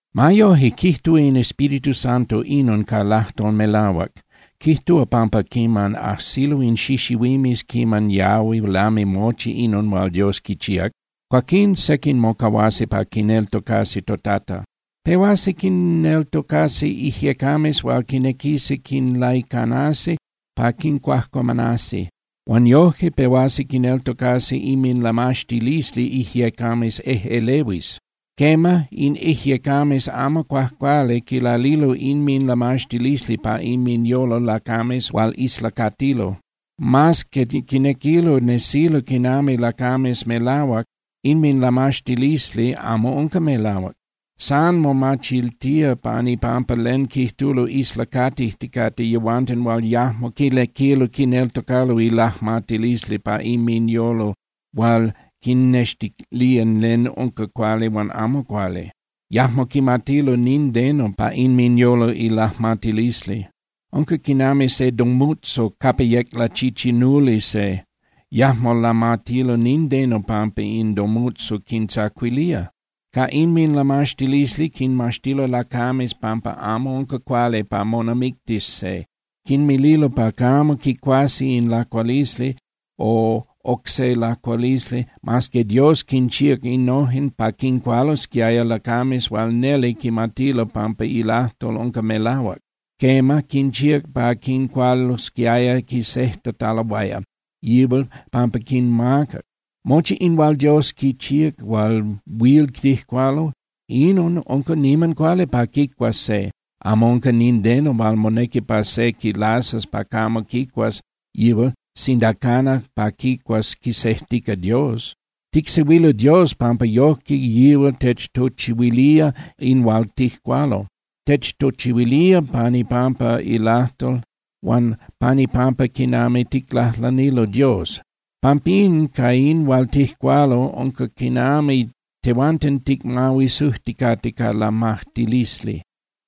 Ma yoje, quijtúa in Espíritu Santo inon ca lajtol melahuac. Quijtúa pampa quiman ajsilo in xixihuimes quiman yahui lami mochi inon hual Dios quichíac, cuaquín sequin mocahuasi pa quineltocasi toTata. Pehuasi quinneltocasi ijyecames hual quinequisi quinlaicanasi pa quincuajcuamanasi, huan yojque pehuasi quineltocasi inminlamaxtilisli ijyecames ejꞌelehuis. Quema, in ijyecames amo cuajcuali quilalilo inminlamaxtilisli pa inminyolo lacames hual islacatilo. Mas que quinequilo nesilo quinami lacames melahuac, inminlamaxtilisli amo unca melahuac. San momachiltía pan ipampa len quijtulo islacatijticate yehuanten hual yajmo quinequilo quineltocalo ilajmatilisli pa inminyolo hual quinnextilía len unca cuali huan amo cuali. Yajmo quimatilo nindeno pa inminyolo ilajmatilisli. Unca quinami se domutzo capa yec lachichinuli se, yajmo lamatilo nindeno pampa in domutzo quintzacuilía. Ca inminlamaxtilisli, quinmaxtilo lacames pampa amo unca cuali pa monamictis se. Quinmililo pa camo quicuasi in lacualisli o oc se lacualisli, mas que Dios quinchíac innojen pa quincualosquiaya lacames hual neli quimatilo pampa ilajtol unca melahuac. Quema, quinchíac pa quincualosquiaya quisejtataloaya yihual pampa quinmacac. Mochi in hual Dios quichíac hual huil tijcualo, inon unca niman cuali pa quicuas se. Amo unca nindeno hual monequi pa se quilasas pa camo quicuas yihual sinda cana pa quicuas quisejtica Dios. Ticsehuilo Dios pampa yojque yihual techtuchihuilía in hual tijcualo. Techtuchihuilía pan ipampa ilajtol huan pan ipampa quinami ticlajlanilo Dios. Pampín, ca in hual tijcualo unca quinami tehuanten ticmahuisujticate ca lamajtilisli.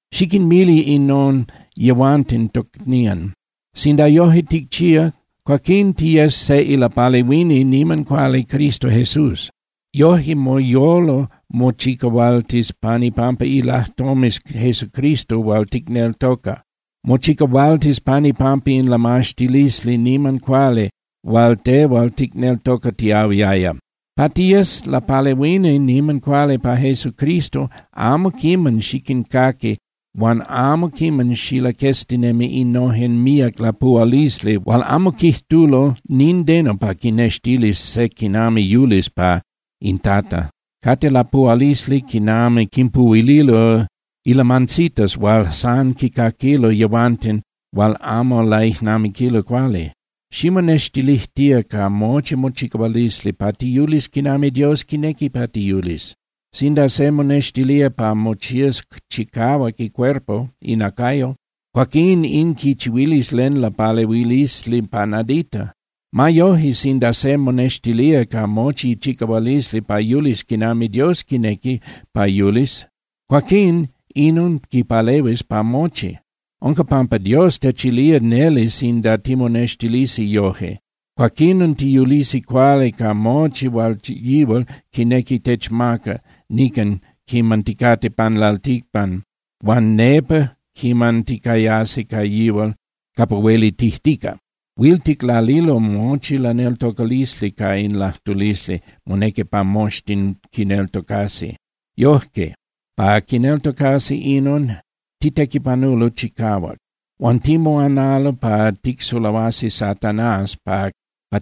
Xiquinmili inon yehuanten tocnían. Sinda yoje ticchía, cuaquín tiyes se ilapalehuini niman cuali Cristo Jesús. Yoje moyolo mochicahualtis pan ipampa ilajtomes Jesucristo hual ticneltoca, mochicahualtis pan ipampa in lamaxtilisli niman cuali hual tehual ticneltocatiahuiaya. Pa tiyes lapalehuini niman cuali pa Jesucristo, amo quiman xiquincaqui huan amo quiman xilaqueztinemi innojen míac lapuhualisli hual amo quijtulo nindeno pa quinextilis se quinami yulis pa in Tata. Cate lapuhualisli quinami quinpuhuililo ilamantzitas hual san quicaquilo yehuanten hual amo laijnamiquilo cuali. Ximonextilijtía ca mochi mochicahualisli pa tiyulis quinami Dios quinequi pa tiyulis. Sinda se monextilía pa mochías chicahuac icuerpo (inacayo), cuaquín in quichihuilis len lapalehuilisli pa nadita. Ma yoje, sinda se monextilía ca mochi ichicahualisli pa yulis quinami Dios quinequi pa yulis, cuaquín inon quipalehuis pa mochi. Unca pampa Dios techilía neli sinda timonextilisi yoje, cuaquinon tiyulisi cuali ca mochi hual yihual quinequi techmaca nican quiman ticate pan lalticpan huan nepa quiman ticayasi ca yihual capa huelitijtica. Huil ticlalilo mochi laneltocalisli ca in lajtulisli, monequi pa moxtin quineltocasi. Yoje, pa quineltocasi inon, titequipanulo chicahuac. Huan timoanalo pa ticsulahuasi Satanás pa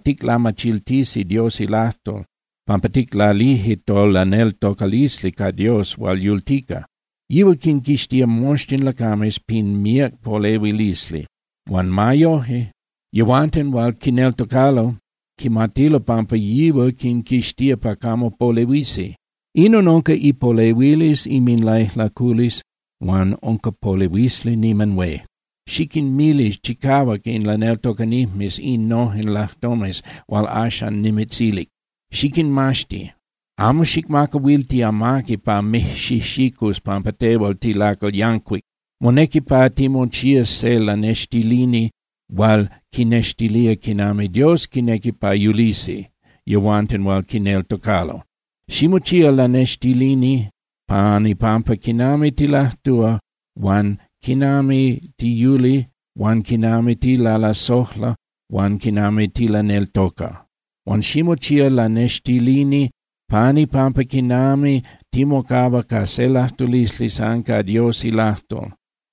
ticlamachiltisi Dios ilajtol, pampa ticlalije tolaneltocalisli ca Dios hual yultica. Yihual quinquixtía moxtin lacames pin míac polehuilisli. Huan ma yoje, yehuanten hual quineltocalo quimatilo pampa yihual quinquixtía pa camo polehuisi. Inon unca ipolehuilisli inminlaijlaculisli huan unca polehuilisli niman hué. Xiquinmili chicahuac in laneltocanijmes innojen lajtomes hual axan nimitzilic, xiquinmaxti. Amo xicmacahuilti amaqui pa mijxijxicus pampa tehual tilacal yancuic. Monequi pa timochías se lanextilini hual quinextilía quinami Dios quinequi pa yulisi yehuanten hual quineltocalo. Ximochía lanextilini pan ipampa quinami tilajtúa huan quinami tiyuli huan quinami tilalasojla huan quinami tilaneltoca. Huan ximochía lanextilini pan ipampa quinami timocahua ca se lajtulisli san ca Dios ilajtol.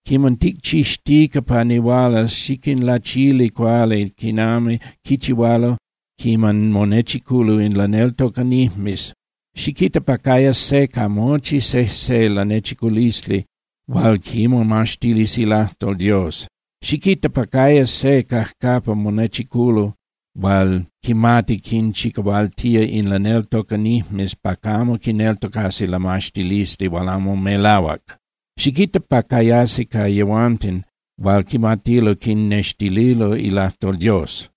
Quiman ticchixtica pa nihualas, xiquinlachili cuali quinami quichihualo quiman monechiculo in laneltocanijmes. Xiquita pa cayas se ca mochi sejse lanechiculisli hual quinmomaxtilis ilajtol Dios. Xiquita pa cayas se cajcapa monechiculo hual quimati quinchicahualtía in laneltocanijmes pa camo quineltocasi lamaxtilisli hual amo melahuac. Xiquita pa cayasi ca yehuanten hual quimatilo quinnextililo ilajtol Dios.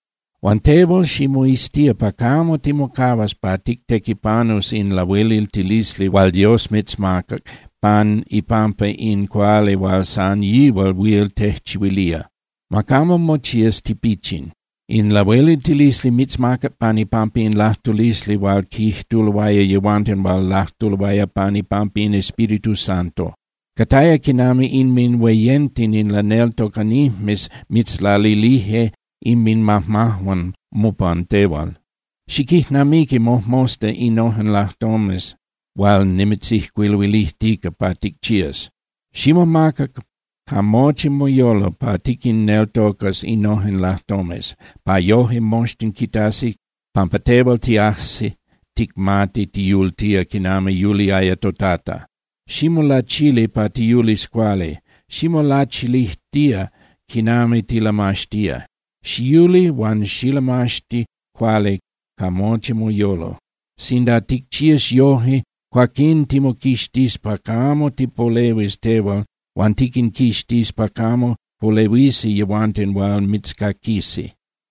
Huan tehual ximoiztía pa camo timocahuas pa tictequipanus in lahueliltilisli hual Dios mitzmacac pan ipampa in cuali hual san yihual huil tejchihuilía, ma camo mochías tipichin. In lahueliltilisli mitzmacac pan ipampa in lajtulisli hual quijtuloaya yehuanten hual lajtuloaya pan ipampa in Espíritu Santo. Cataya quiman inminhueyenten in laneltocanijmes mitzlalilije inminmajmajuan mopan tehual. Xiquijnamiqui mojmosta innojen lajtomes hual nimitzijcuiluilijtica pa ticchías. Ximomaca ca mochi moyolo pa tiquinneltocas innojen lajtomes, pa yoje moxtin quitasi pampa tehual tiajsi ticmati tiyultía quinami yuliaya toTata. Ximolachili pa tiyulis cuali, ximolachilijtía quinami tilamaxtía. Xiyuli huan xilamaxti cuali ca mochi moyolo. Sinda ticchías yoje, cuaquín timoquixtis pa camo tipolehuis tehual huan tiquinquixtis pa camo polehuisi yehuanten hual mitzcaquisi.